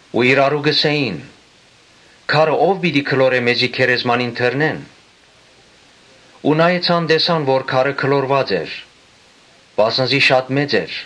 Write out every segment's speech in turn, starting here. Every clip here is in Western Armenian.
Ու իրարու կ’ըսէին. «Քարը ո՞վ պիտի գլորէ մեզի գերեզմանին դռնէն», (Ու նայեցան տեսան որ քարը գլորուած էր,) վասն զի շատ մեծ էր։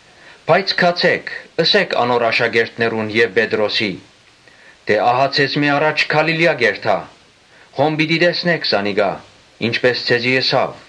Ուրեմն գացէ՛ք, ըսէ՛ք անոր աշակերտներուն եւ Պետրոսին, թէ ահա ձեզմէ առաջ Գալիլիա կ’երթայ. հոն պիտի տեսնէք զանիկա՝ ինչպէս ձեզի ըսաւ»։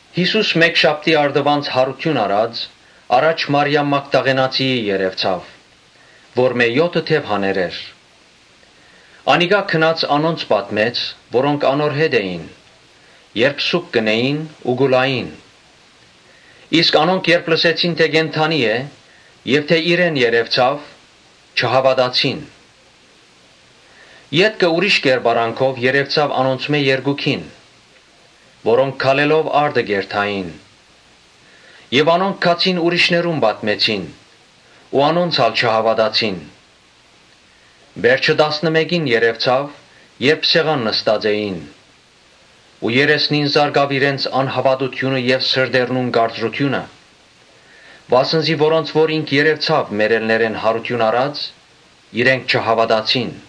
Յիսուս մէկշաբթի առտուն յարութիւն առած՝ առաջ Մարիամ Մագդաղենացիին երեւցաւ, որմէ եօթը դեւ հաներ էր։ Անիկա գնաց անոնց պատմեց՝ որոնք իր հետն էին, երբ սուգ կ’ընէին ու կու լային։ Իսկ անոնք երբ լսեցին թէ կենդանի է եւ երեւցաւ, չհաւատացին։ Ետքը ուրիշ կերպարանքով երեւցաւ անոնցմէ երկուքին՝ որոնք քալելով արտը կ’երթային։ Անոնք գացին միւսներուն պատմեցին։ Անոնք ալ չհաւատացին։ Վերջը տասնըմէկին երեւցաւ, երբ սեղան նստած էին ու դատապարտեց իրենց անհաւատութիւնը եւ սրտերնուն կարծրութիւնը, վասն զի որոնց՝ որ ինք երեւցաւ մեռելներէն յարութիւն առած՝ իրենք չհաւատացին։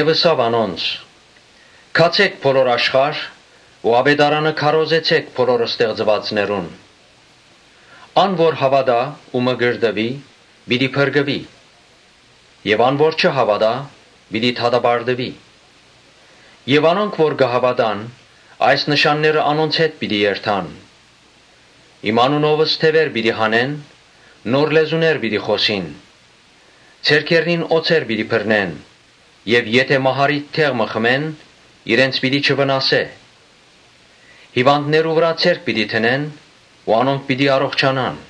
Ըսաւ անոնց. «Գացէ՛ք բոլոր աշխարհ ու աւետարանը քարոզեցէք բոլոր ստեղծուածներուն։ Ան որ հաւատայ ու մկրտուի՝ պիտի փրկուի եւ ան որ չհաւատայ՝ պիտի դատապարտուի։ Անոնք որ կը հաւատան, այս նշանները անոնց հետ պիտի երթան. Իմ անունովս դեւեր պիտի հանեն, նոր լեզուներ պիտի խօսին. Ձեռքերնին օձեր պիտի բռնեն եւ եթէ մահառիթ դեղ մը խմեն, իրենց պիտի չվնասէ. հիւանդներու վրայ ձեռք պիտի դնեն ու անոնք պիտի առողջանան»։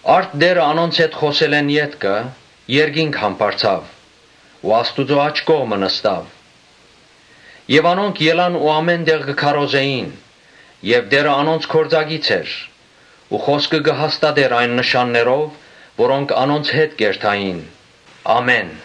Արդ Տէրը անոնց հետ խօսելէն ետքը երկինք համբարձաւ ու Աստուծոյ աջ կողմը նստաւ։ Անոնք ելան ու ամէն տեղ կը քարոզէին եւ Տէրը անոնց գործակից էր ու խօսքը կը հաստատէր այն նշաններով, որոնք անոնց հետ կ’երթային։ Ամէն։